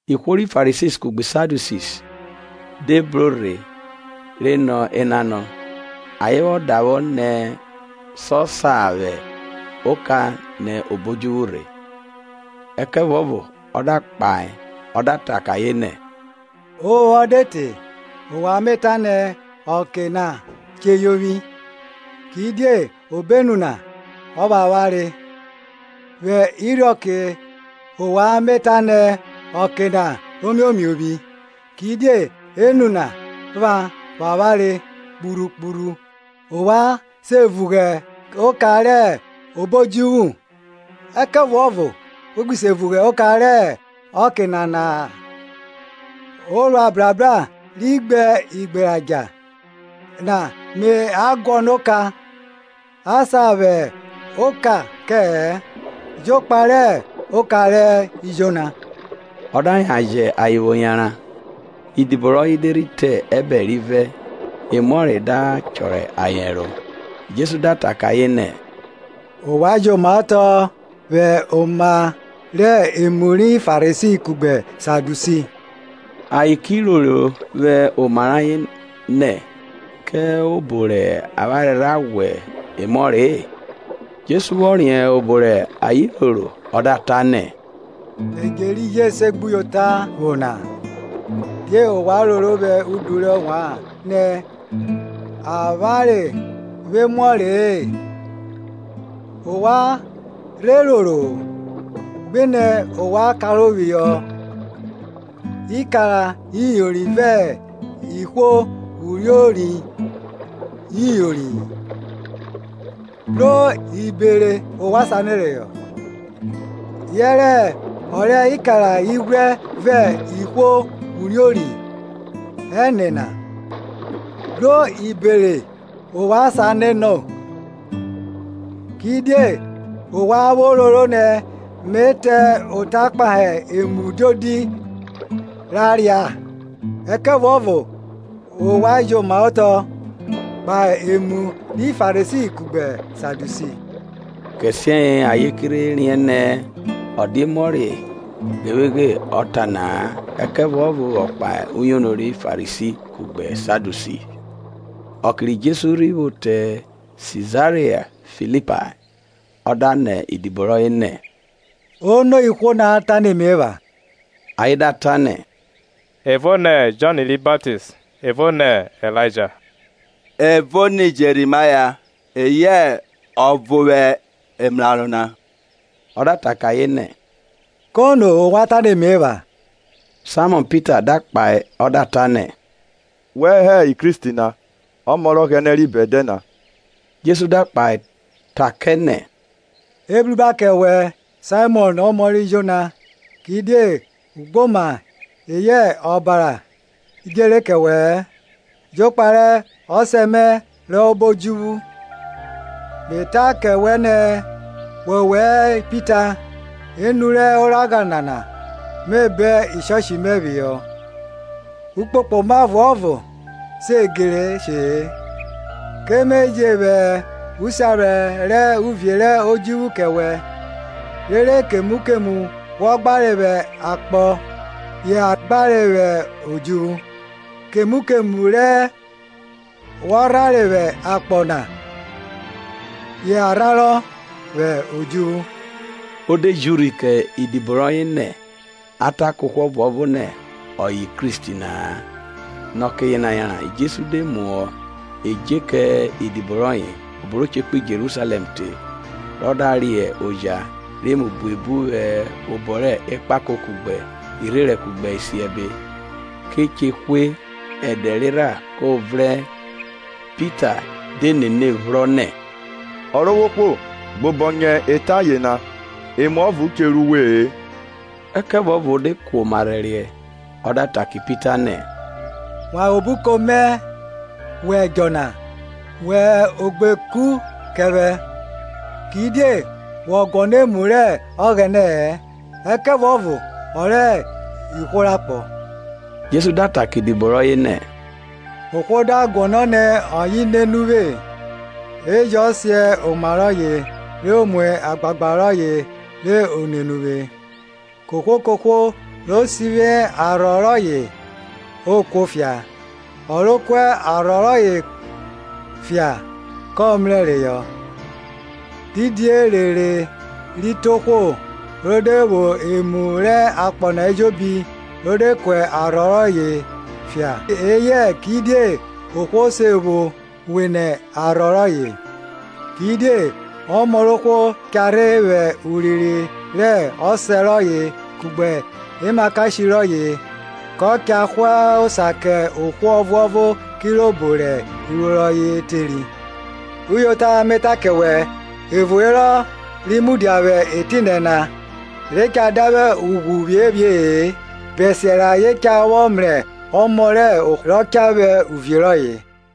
Ihwo ri Farisi kugbe Sadiusi de bro rhe re nọ enanọ, rẹ ayen vwo davwọ ni sọ sa vwẹ oka nẹ obo odjuvwu rhe. Ẹkẹvuọvo ọ da kpahe ọ da ta kẹ ayen nẹ, ovwọnvwọn de te, ovwan me ta nẹ, ọke na che yovwi: kidie obenu na ọvwavware. Vwẹ irhiọke ovwan me ta nẹ, ọke na omiomiovwi, kidie enu na pha vwavware kpurhu kpurhu. Ovwan se vughe oka rẹ obo odjuvwu; ẹkẹvuọvo we gbi se vughe oka rẹ ọke nana-a. Orua brabra ri gbe igberadja na me a guọnọ oka; a sa vwẹ oka kẹ-ẹ, jokpa rẹ oka ri Jona. Ọ da yan jẹ ayen vwo yanran. Idibo rọye de rhi te ẹbẹre rivẹ, emuọre da chọrọ ayen ẹro. Jesu da ta kẹ ayen nẹ, Ovwan jomaotọ vwẹ oma rẹ emu ri Farisi kugbe Sadiusi. Ayen ki roro vwẹ omoma rẹ ayen nẹ, kẹ obo rẹ avwanre rha ghwa emuọre-e. Jesu vwọ riẹn obọ rẹ ayen roro, ọ da ta nẹ, Edje ri jẹ esegbuyota evwo na, Die ovwan roro vwẹ udu rẹ ovwan nẹ, avwanre vwo emuọre-e? Ovwan rhe roro, ghinẹ ovwan karohọ ikara iyori vẹ ihwo uriori iyori-i, bro ibere ovwan sanọ reyọ? Yẹrẹ ọ rẹ ikara ighwrẹ vẹ ihwo uriori ẹne na, bro ibere ovwan sanọ no? Kidie ovwan vwo roro nẹ me ta ota kpahe emu diodi ra ria? Ẹkẹvuọvo ovwan jomaotọ kpahe emu ri Farisi kugbe Sadiusi. Kẹsiẹye ayen ke rhe riẹn nẹ, ọ dia emuọre ghevweghe ọ ta na-a, ẹkẹvuọvo vwọ kpahe uyono ri Farisi kugbe Sadiusi. Ọke ri Jesu rhi vwo te Sizaria Filipae, ọ da nọ idibo rọye nẹ, Ono ihwo na ta nẹ me epha? Ayen da ta nẹ, evo nẹ Jọn ri Baptist, evo nẹ Ilaija; evo nẹ Jẹrimaya, eyẹ ọvo vwẹ emraro na. Ọ da ta kẹ ayen nẹ, kono ovwan ta ne me epha? Saimọn Pita da kpahe ọ da ta nẹ, Wẹ hẹ Kristi na, Ọmọ rẹ Ọghẹnẹ ri bẹdẹ na. Jesu da kpahe ta kẹ nẹ, Ebruba kẹ wẹ Saimọn omo ri Jona; kidie ugboma eyẹ ọbara djere kẹ wẹ-ẹ, jokpa rẹ ọsẹ mẹ rọ hẹ obo odjuvwu. Me ta kẹ wẹ nẹ, wọwẹ hẹ Pita, enu rẹ oragha nana me bọn ishọshi mẹ phihọ; ukpokpoma ọvuọvo se gere she-e. Ke me je vwẹ usiaphrẹ rẹ uvie rẹ odjuvwu kẹ wẹ, rere kemu kemu wọ gbare vwẹ akpọ ya gbarọ vwẹ odjuvwu: kemu kemu re wọ rhanre vwẹ akpọ na ya rhanrọ vwẹ odjuvwu. Ọ de ji urhi kẹ idibo rọye nẹ, a ta kẹ ohwo ọvuọvo nẹ ọye hẹ Kristi na-a. Nẹ ọke yena yanran Jesu de muhọ edje kẹ idibo rọye, obo ro che kpo Jerusalẹm rọ da re oja rẹ emu buebu vwẹ obọ rẹ ekpako kugbe irherẹn kugbe isiẹbe, ke che hwe, ẹdẹ rerha ko vrẹn. Pita de nene phro nẹ, Ọrovwohwo gbobọnyẹ eta yena, emuọvo che ru we-e. Ẹkẹvuọvo o de kuoma rhẹriẹ, ọ da ta kẹ Pita nẹ, Wan nẹ obuko mẹ wẹ Ẹdjọ na; Wẹ oshegberi kẹ vwẹ, kidie wọ guọnọ emu rẹ Ọghẹnẹ-ẹ, ẹkẹvuọvo ọ rẹ ihwo rẹ akpọ. Jesu da ta kẹ idibo rọye nẹ, ohwo da guọnọ nẹ ọye nene uvwe, e jọ siẹn oma rọye re o mu agbagba rọye re o nene uvwe. Kohwo kohwo ro sivwi arhọ rọye o kuọfia; ọ ro ku arhọ rọye fia kọ mrẹ reyọ. Didi erere ri te ohwo, ro de vwo emu rẹ akpọ na ejobi, ro de ku arhọ rọye fia? eyẹ kidie ohwo se vwo wene arhọ rọye? Kidie ọmọ rẹ ohwo cha rhe vwẹ urinrin rẹ Ọsẹ rọye kugbe emakashe rọye; kọ cha hwa osa kẹ ohwo ọvuọvo kirobo rẹ iruo rọye teri. Uyota me ta kẹ wẹ, evo herọ ri mudia vwẹ etinẹ na, re cha davwe ughwu phiephie-e, bẹsiẹ rẹ ayen cha vwọ mrẹ Ọmọ rẹ ohwo rọ cha vwẹ uvie rọye.